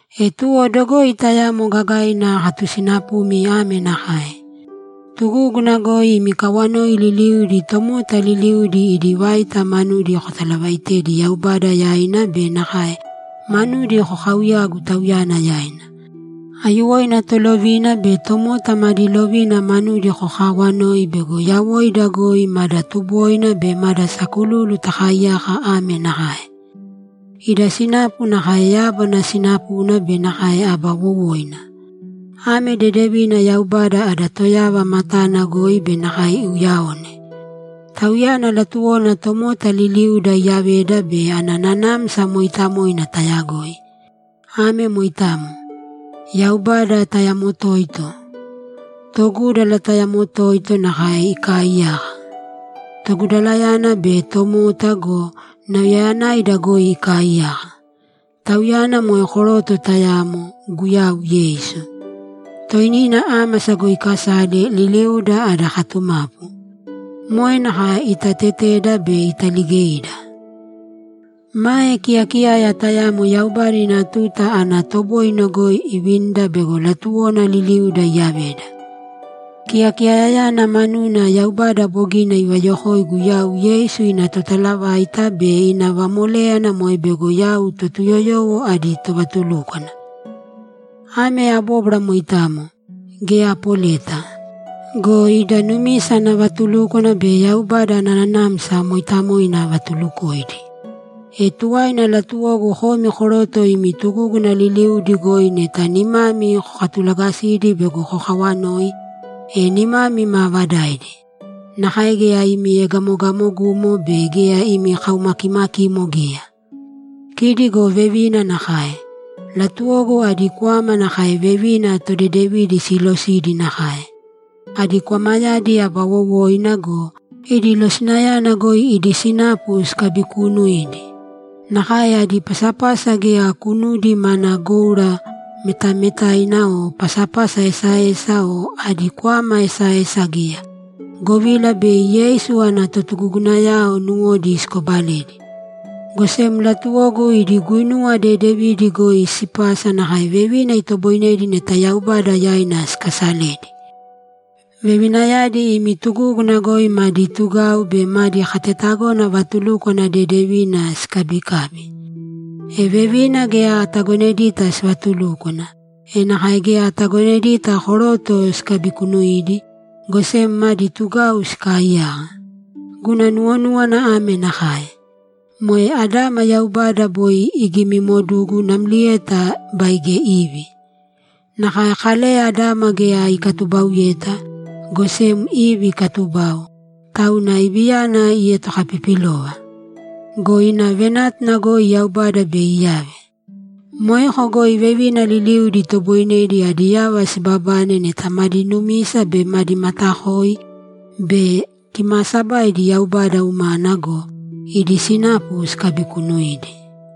E tuwo dogoi tayamo gagaina akatusinapumi ame nakae: Tugúguna goi imi kawanoi liliudi tomota liliudi idi vaita manudi kotalavaaitēdi Yaubada yaina be nakae manudi kokaauyāgu Tauyana yaina. Aiyuwoina tolovina be tomota madi lovina manudi kokaawanōi bego yawoida goi mada tuboina be mada sakululu takaaiyaka ame nakae: Ida sinapu nakae yábana sinapuna be nakae aba wowoina. Ame dedevina Yaubada ada Toyava matana goi be nakae iuyaone. Tauyana latuwona tomota liliuda iyaveda be ana Nanamsa Mooitamoina tayagoi. Ame moitamo. Yaubada tayamo toito. Togúdala tayamo toito nakae ikaaiyaka. Togudalayana be tomota go, nauyayanaida goi ikaaiyaka. Tauyana moe koroto tayamo, Guyau Yeisu. Toinina ámasa goi ikasale, liliuda ada katumapu. Moe nakae itateteda be italigeida. Mae kiyakiyaya tayamo Yaubada ina tuta ana toboine goi ivinida bego latuwona liliuda iyaveda. Kiyakiyayayana manuna Yaubada bogina ivayokoigu yau Yeisu ina totalavaita be ina vamoléyana moe bego yau Totuyoyowo adi tovatulúkwana. Ame abóbwara moitamo; geya apoleta. Go ida numisa ana vatulúkwana be Yaubada ana Nanamsa Mooitamoina avatulukoidi. E tuwaina latuwogu komi koroto imi tugúguna liliudi goi neta nimami kokatulagasidi bego kokawanoi, e nimami maavadaidi. Nakae geya imi egamogamogumo be geya imi kaumakimakimo geya. Kidi go vevina nakae; latuwogu adi kwama nakae vevina todedevidi siilosidi nakae. Adi kwamayadi aba wowoina go, idi losinayana goi idi sinapu sikabikuunuīdi. Nakae adi pasapasa geya kunudi mana goura metametaina o pasapasa esaesa o adi kwama esaesa geya, govila bei Yeisu ana totugugunayao nuwodi sikobaledi. Go sem latuwogu idi guinuwa dedevidi goi sipasa nakae vevina itoboinedi neta Yaubada yaina sikaasaledi. Vevinayadi imi tugúguna goi madi tugau be madi katetagona vatulúkwana dedevina sikabikābi. E vevina geya atagonedita sivatulúkwana, e nakae geya atagonedita koroto sikabikunuidi, go sem madi tugau sikaaiyaka. Guna nuwonúwana ame nakae: Moe Adama Yaubada boi igimimodugu namlieta baige Ivi. Nakae Kaleya Adama geya ikatubauyeta, go sem Ivi ikatubau, tauna Iviyana ietokapipilova. Go ina venátuna goi Yaubada bei iyave. Moeko goi vevina liliudi itoboinedi adi yava sibabane neta madi numisa be madi matakoi be kimaasabaidi Yaubada umana go, idi sinapu sikabikunuidi.